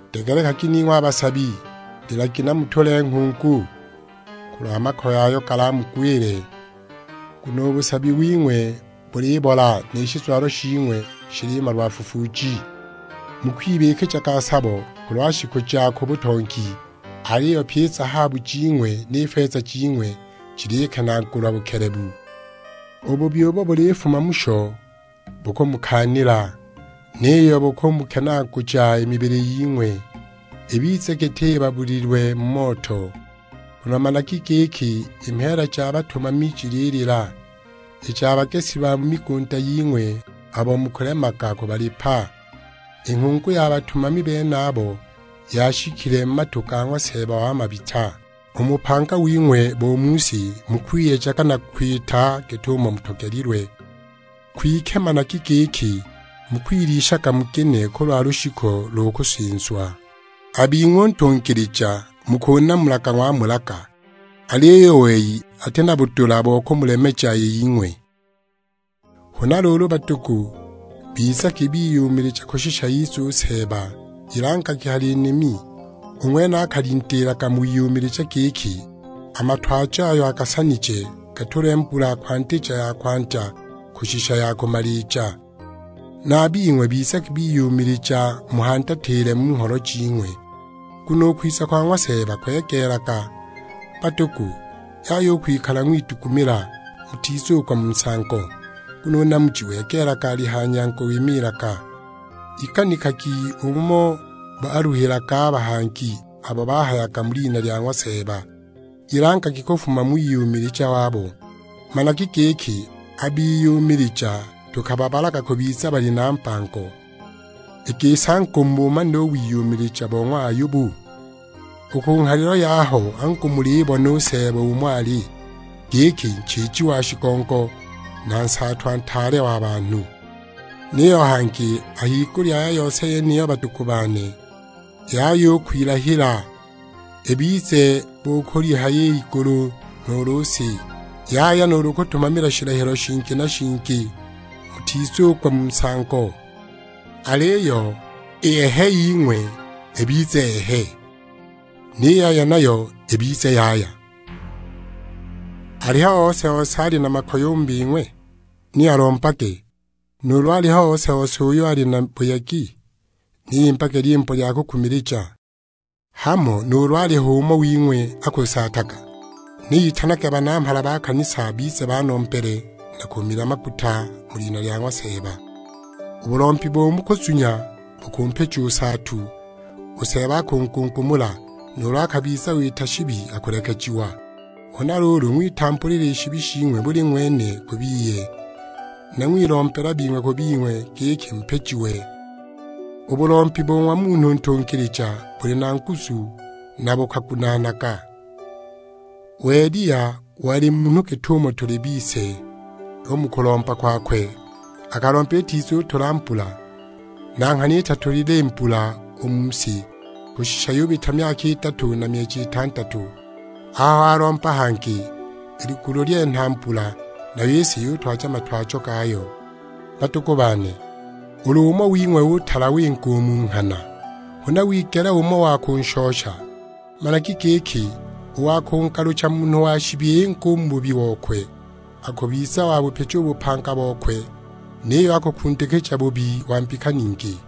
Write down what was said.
Degelekagi ning'we a basabi, lilagi na mutule nghungu, kulwa makoye ayo galamugwile. Nguno u busabi wing'we bulibola, ni shizwalo shing'we shilimalwa fufuuji! Mukwibikijaga sabo kulwa shiku ja ku butongi, aliyo pyi i zahabu jing'we ni feza jing'we jilikenaagulwa bukelebu. U bubi ubo bulifuma musho bukumukaanila; niyo bukumukenaaguja i mibili ying'we, ibize giti ibabulilwe mu moto. Nguno managi giki i mheela ja batumami jililila, i ja bagesi ba mu migunda ying'we abo mukulemaga kubalipa; i nghungu ya batumami benabo yashikile mu matu ga ng'wa Seeba wa mabita. U mu bupanga wing'we bo mu si mukwiyejaga na kwita git'umo mutogelilwe; kwike managi giki mukwilishaga mugine kulwa lushiku lo kusinzwa! A bing'we u ntungilija mukunamulaga ng'wamulaga; aliyo u wei ati na budula bo kumulemeja i ying'we! Huna luulu badugu, bizagi biyumilija kushisha ize u Seeba; ilangilagi hali nimi, u ng'wene akalindiilaga mu wiyumilija giki a matwajo ayo agasanije gatulwe mbula kwandija ya kwandya kushisha ya kumalija. Na a bing'we bizagi biyumilija muhandatile u mu ngholo jing'we, nguno u kwiza kwa ng'wa Seeba kwegeelaga. Badugu, yaya u kwikala ng'widugumila, mutizugwa mu nsango; nguno u namuji wegeelaga, ali ha nyango wimiilga. Iganikagi umo baluhilaga a bahangi abo bahayaga mu lina lya ng'wa Seeba, ilangagi kufuma mu wiyumilija wabo. Managi giki a biyumilija tukababalaga kubiza bali na mbango. I gisi angu mubumanile u wiyumilija bo ng'wa Ayobu? U ku nghalilo yaho angu mulibona u Seeba umo ali, giki nchiiji wa shigongo, na nsaatwa ntaale wa banhu! Niyo hangi a higulya ya yose yeniyo badugu bane, yaya u kwilahila, ibize bo kulihaya igulu, nuulu si; yaya nuulu kutumamila shilahilo shingi na shingi, mutizugwa mu nsango, aliyo i Ehe ying'we ibize Ehe, ni Yaya nayo ibize Yaya. Aliho ose-ose ali na makoye u mu bing'we? Ni alombage. Nuulu aliho ose-ose uyo ali na buyegi? Ni imbage lyimbo lya kukumilija. Hamo nuulu aliho umo wing'we akusaataga? Ni itanage banamhala ba kanisa bize banombele na kumila maguta mu lina lya ng'wa Seeba. U bulombi bo mu kuzunya bukumpija u nsaatu, u Seeba akungungumula; nuulu akabiza wita shibi akulekejiwa. Huna luulu ng'witambulila i shibi shing'we buli ng'wene ku biye, na ng'wilombela bing'we ku bing'we giki mupijiwe. U bulombi bo ng'wa munhu ntungilija buli na nguzu na bukagunaanaga. U Eliya wali munhu git'umo tuli bise, u mu kulomba kwakwe akalomba itizutula mbula; na nghana itatulile i mbula u mu si, kushisha yubita myaka idatu na myeji itandatu. Aho walomba hangi, i ligulu lyenha mbula, nayo i si yutwaja matwajo gayo. Badugu bane, ulu umo wing'we utala winga u mu nghana, huna wigela umo wa kunshosha, managi giki u wa kungalucha munhu wa shibi inge mu bubi bokwe, akubiza wabupija u bupanga bokwe; niyo akukundikija bubi wa mbika ningi.